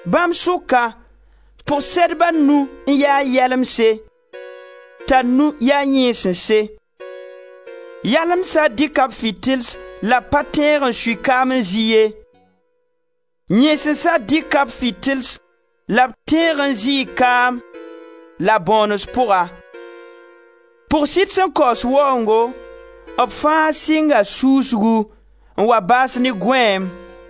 Bãmb sʋka, pʋg-sɛdb a nu n ya yalemse, t'a nu ya yẽesense. Yalemsa dɩka b fitils la b pa tẽeg n sui kaam n zɩ ye. Yẽesensã dɩka b fitils la b tẽeg n zɩɩ kaam, la-bõones pʋga. Pʋg-sɩd sẽn kaoos waoongo, b fãa sɩnga suusgu, n wa baas ne gõeem.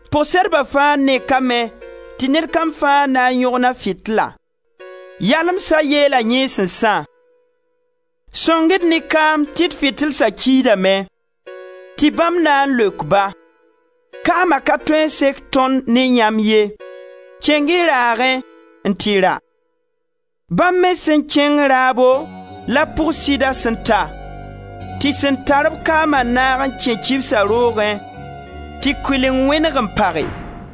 Pʋg-sɛdba fãa nekame tɩ ned kam fãa na n yõgen a fitila. Yalemsa yeela yẽesensã: ‹Sõng-y-d ne kaam tɩ d fitilsa kiidame!› Tɩ bãmb na n leok-ba: ‹Kaama ka tõe n sek tõnd ne yãmb ye, kẽng-y raagẽ n tɩ ra.› Bãmb me sẽn kẽng raabo la pʋg-sɩda sẽn ta, tɩ sẽn tar-b kaama naag n kẽ kibsa roogẽ, tɩ kʋɩleng wẽneg n page.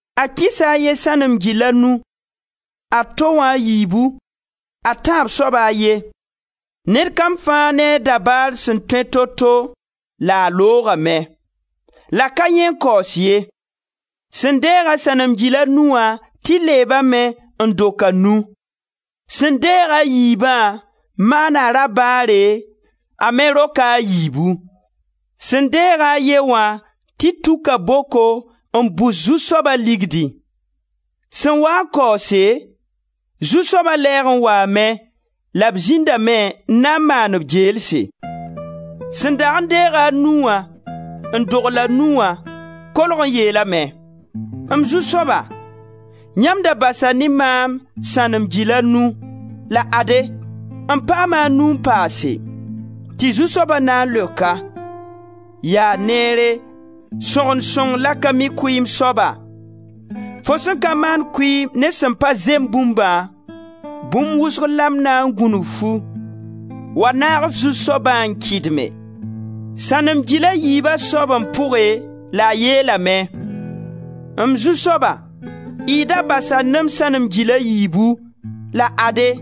A kɩsa a ye, sãnem gil a nu, a to wã a yiibu, a tãab soaba a ye: ned kam fãa ne a dabaar sẽn tõe to-to la a loogame. La ka yãee n kaoos ye, sẽn deeg-a sãnem gil a nu wã tɩ leebame n dok a nu. Sẽn deeg-a a yiibã maana rabaare a me roka a yiibu. Sẽn deeg-a a ye wã tɩ tuka boko n bus zu-soaba ligdi. Sẽn waa n kaoose, zu-soaba lɛɛg n waame la b zĩndame n maan b geelse. Sẽn dag n deeg-a a nu wã n dogl a nu wã kolg n yeelame: ‹M zu-soaba, yãmb da basa ne maam sãnem gil a nu la ade, m paama a nu n paase.› Tɩ zu-soaba na n leok-a: ‹Yaa neere, sõgen sõng la ka mi kʋɩɩm soaba, fo sẽn ka maan kʋɩɩm ne sẽn pa zem bũmbã, bũmb wʋsgo la m na n gũnug-fu; wa naag f zu-soabã n kɩdme.› Sãnem gila yiiba soab n pʋge la a yeelame: ‹M zu-soaba, y da basa ne-m sãnem gil a yiibu, la ade,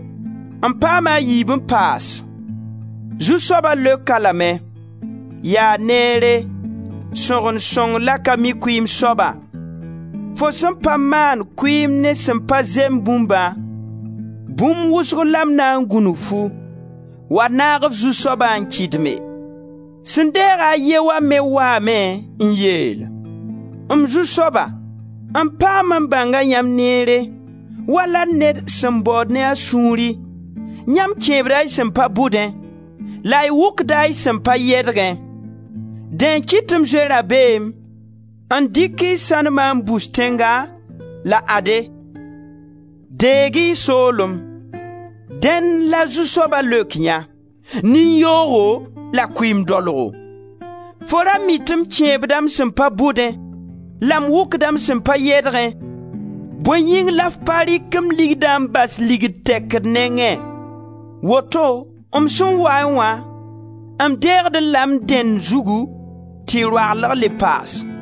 m paama a yiib n paas.› Zu-soaba leok-a lame: ‹Yaa neere, sõgen sõng la ka mi kʋɩɩm soaba, fo sẽn pa maan kʋɩɩm ne sẽn pa zem bũmbã, bũmb wʋsg la m na n gũnug-fu; wa naag f zu-soabã n kɩdme.› Sẽn deeg-a a ye wã me waame n yeel: ‹M zu-soaba, m paam n bãnga yãmb neere wala ned sẽn baood ne a sũuri; yãmb kẽebda y sẽn pa bʋdẽ, la y wʋkda y sẽn pa yedgẽ. Dẽ n kɩt tɩ m zoe rabeem n dɩk y sãnema n bus tẽnga, la ade, deeg-y y soolem.› Dẽn la zu-soaba leok yã: ‹Nin-yoogo la kʋɩɩm daolgo, fo ra mii tɩ m kẽebda m sẽn pa bʋdẽ, la m wʋkda m sẽn pa yɛdgẽ, bõe yĩng la f pa rɩk m ligdã n bas ligd tɛkd nengẽ, woto m sẽn waẽ wã, m deegdẽ la m dẽnd zugu tɩ roaglg le paas.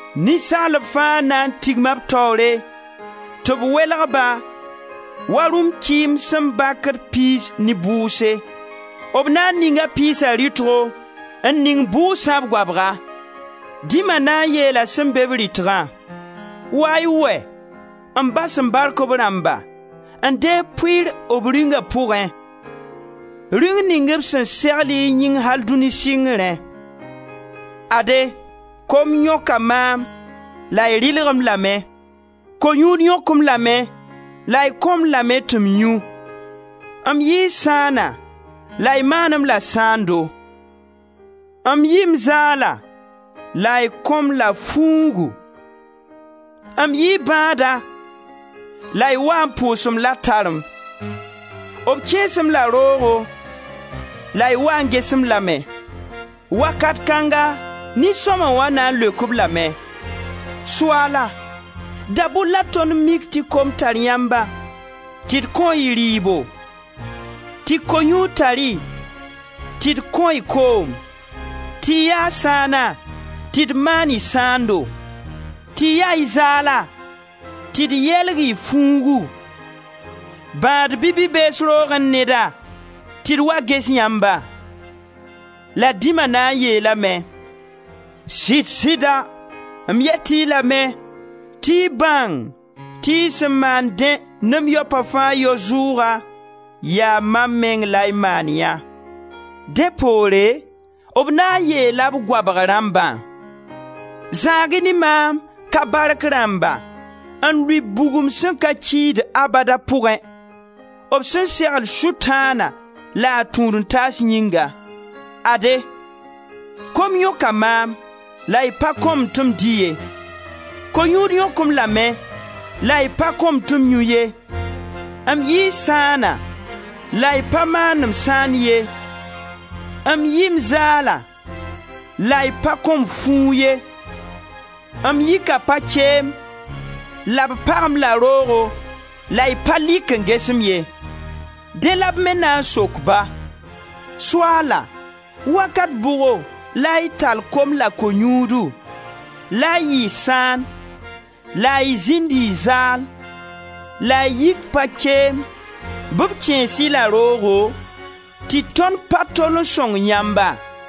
Ninsaalb fãa na n tigma b taoore tɩ b welg-ba wa rũm-kɩɩm sẽn bakd pe-yãans ne boeese. B na n ninga pe-yaansa rɩtgo, n ning boeesã b goabga. Dĩma na n yeela sẽn beb rɩtgã: ‹Wa-y wɛ, m Ba sẽn bark b rãmba, n deeg pʋɩɩr b Rĩunga pʋgẽ, Rĩung ning b sẽn segl y yĩng al dũni sɩngrẽ. Ade, kom yõka maam la y rɩlg-m lame, ko-yũud yõk-m lame la y kõ-m lame tɩ m yũ; m yɩɩ sãana la y maan-m la sãando. M yɩɩ m zaala la y kõ-m la fuugu, m yɩɩ bãada la y waa n pʋʋs-m la tarem; b kẽes-m la roogo la y wa n ges-m lame.› Wakat kãnga nin-sõma na n leok-b lame: ‹Soaala, da-bʋr la tõnd mik tɩ kom tar yãmba tɩ d kõ-y rɩɩbo, tɩ ko-yũud tar-y, tɩ d kõ-y koom, tɩ y ya sãana tɩ d maan-y sãando, tɩ ya y zaala tɩ d yeelg-y fuugu, bãad bɩ bi-bees roogẽ neda tɩ d wa ges yãmba?› La dĩma na n yeelame: ‹Sɩd-sɩda m yet-y lame tɩ y bãng tɩ y sẽn maan dẽ ne m yaopa fãa yao zʋʋga, yaa mam meng la y maan yã.› Dẽ poore b na n yeela b goabg rãmbã: ‹Zãag-y ne maam, ka bark rãmba, n lʋɩ bugum sẽn ka kiid abada pʋgẽ, b sẽn segl Sʋtãana la a tũud-n-taas yĩnga. Ade, kom yõka maam la y pa kõ-m tɩ m dɩ ye, ko-yũud yõk-m lame la y pa kõ-m tɩ m yũ ye, m yɩɩ sãana la y pa maan-m sãand ye, m yɩɩ m zaala la y pa kõ-m fuug ye, m yika pa-keem, la b pag-m la roogo la y pa lɩk n ges-m ye.› Dẽ la b me na n sok-ba: ‹Soaala, wakat bʋgo la y tall kom la ko-yũudu, la y yɩ sãan, la y zĩnd y zaal, la y yik pa-keem bɩ b kẽes-y la roogo, tɩ tõnd pa tol n sõng yãmba?›